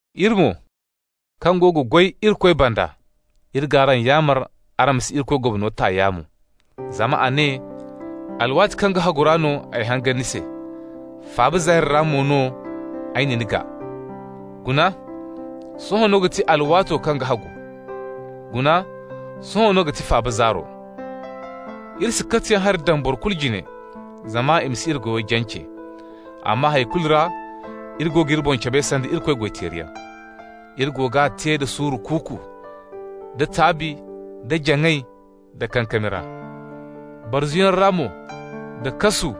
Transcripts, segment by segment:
Iri mo, kaŋ go ga goy Irikoy banda, iri g'araŋ yaamar araŋ ma si Irikoy gomno ta yaamo. Zama a ne: «Alwaati kaŋ ga hagu ra no ay hangan ni se, faaba zaari ra mo no ay na ni gaa.» Guna, sohõ no ga ti alwaato kaŋ ga hagu. Guna, sohõ no ga ti faaba zaaro. Iri si katiyaŋ hari daŋ boro kulu jine, zama i ma si iri goyo jance. Amma hay kulu ra iri go g'iri boŋ cabe sanda Irikoy goy-teeriyaŋ. Iri go g'a te da suuru kuuku, da taabi, da jaŋay, da kankami ra. Barzuyaŋ ra mo, da kasu,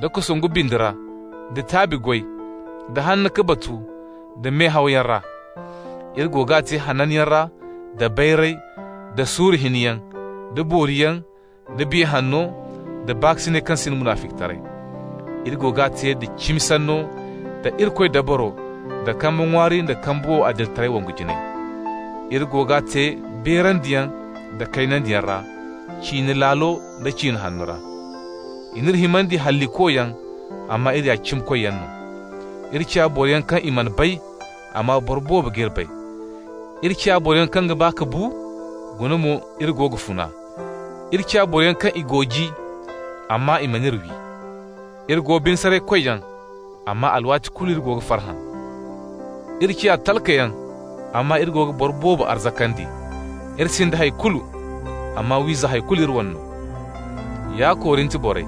da kosongu bindi ra, da taabi goy, da hanna ka batu, da mehawyaŋ ra. Iri go g'a te hananyaŋ ra, da bayray, da suuru hinyaŋ, da booriyaŋ, da Biya Hanno, da baakasinay kaŋ sinda munaficitaray. Iri go g'a te da cimi sanno, da Irikoy dabaro, da kambe ŋwaari da kambe wow adilitaray wongu jinayey. Iri go g'a te beerandiyaŋ da kaynandiyaŋ ra, ciine laalo nda ciine hanno ra. I n'iri himandi hallikoyaŋ amma iri ya cimikoyyaŋ no. Iri ciya boroyaŋ kaŋ i mana bay, amma boro boobo g'iri bay. Iri ciya boroyaŋ kaŋ ga ba ka bu, guna mo iri go ga funa. Iri ciya boroyaŋ kaŋ i gooji, amma i man'iri wi. Iri go bine-saray-koyyaŋ, amma alwaati kulu iri go ga farhã. Iri ciya talkayaŋ, amma iri go ga boro boobo arzakandi. Iri sinda hay kulu, amma wiiza, hay kulu iri wane no. Ya Korint borey,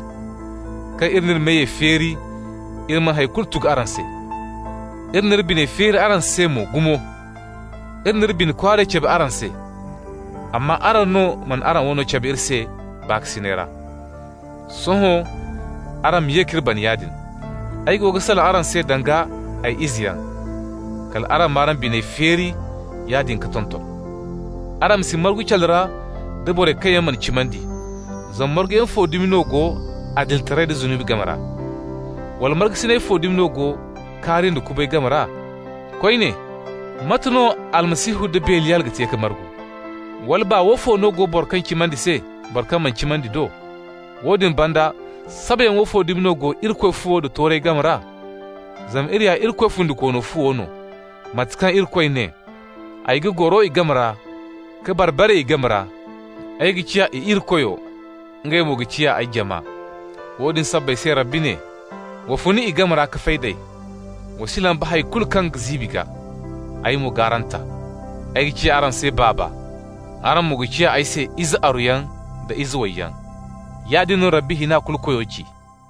kaŋ iri n'iri meyey feeri iri mana hay kulu tugu araŋ se, iri n'iri biney feeri araŋ se mo gumo. Iri n'iri bine kwaaray cabe araŋ se, amma araŋ no mana araŋ wano cabe iri se baakasinay ra. Sohõ araŋ ma ye k'iri bana yaadin -- ay go ga salaŋ araŋ se danga ay izeyaŋ -- kal araŋ m'araŋ biney feeri yaadin ka tonton. Araŋ ma si margu calu ra da borey kaŋ yaŋ mana cimandi. Zama marguyaŋ fo dumi no go adilitaray da zunubi game ra? Wala markasinay fo dumi no go kaari nda kubay game ra? Koyne, mate no Almasihu nda Beliyal ga te ka margu? Wala baa woofo no go boro kaŋ ga cimandi se boro kaŋ mana cimandi do? Woodin banda, sabayaŋ woofo dumi no go Irikoy fuwo da toorey game ra? Zama iri ya Irikoy fundikoono fuwo no, mate kaŋ Irikoy ne: «Ay ga goro i game ra, ka bar-bare i game ra. Ay ga ciya i Irikoyo, ngey mo ga ciya ay jama.» Woodin sabbay se Rabbi ne: «Wa fun i game ra ka fay d'ey. Wa si lamba hay kulu kaŋ ga ziibi gaa, ay mo g'araŋ ta. Ay ga ciya araŋ se Baaba, araŋ mo ga ciya ay se ize aruyaŋ da ize wayyaŋ. Yaadin no Rabbi Hina-Kulu-Koyo ci.»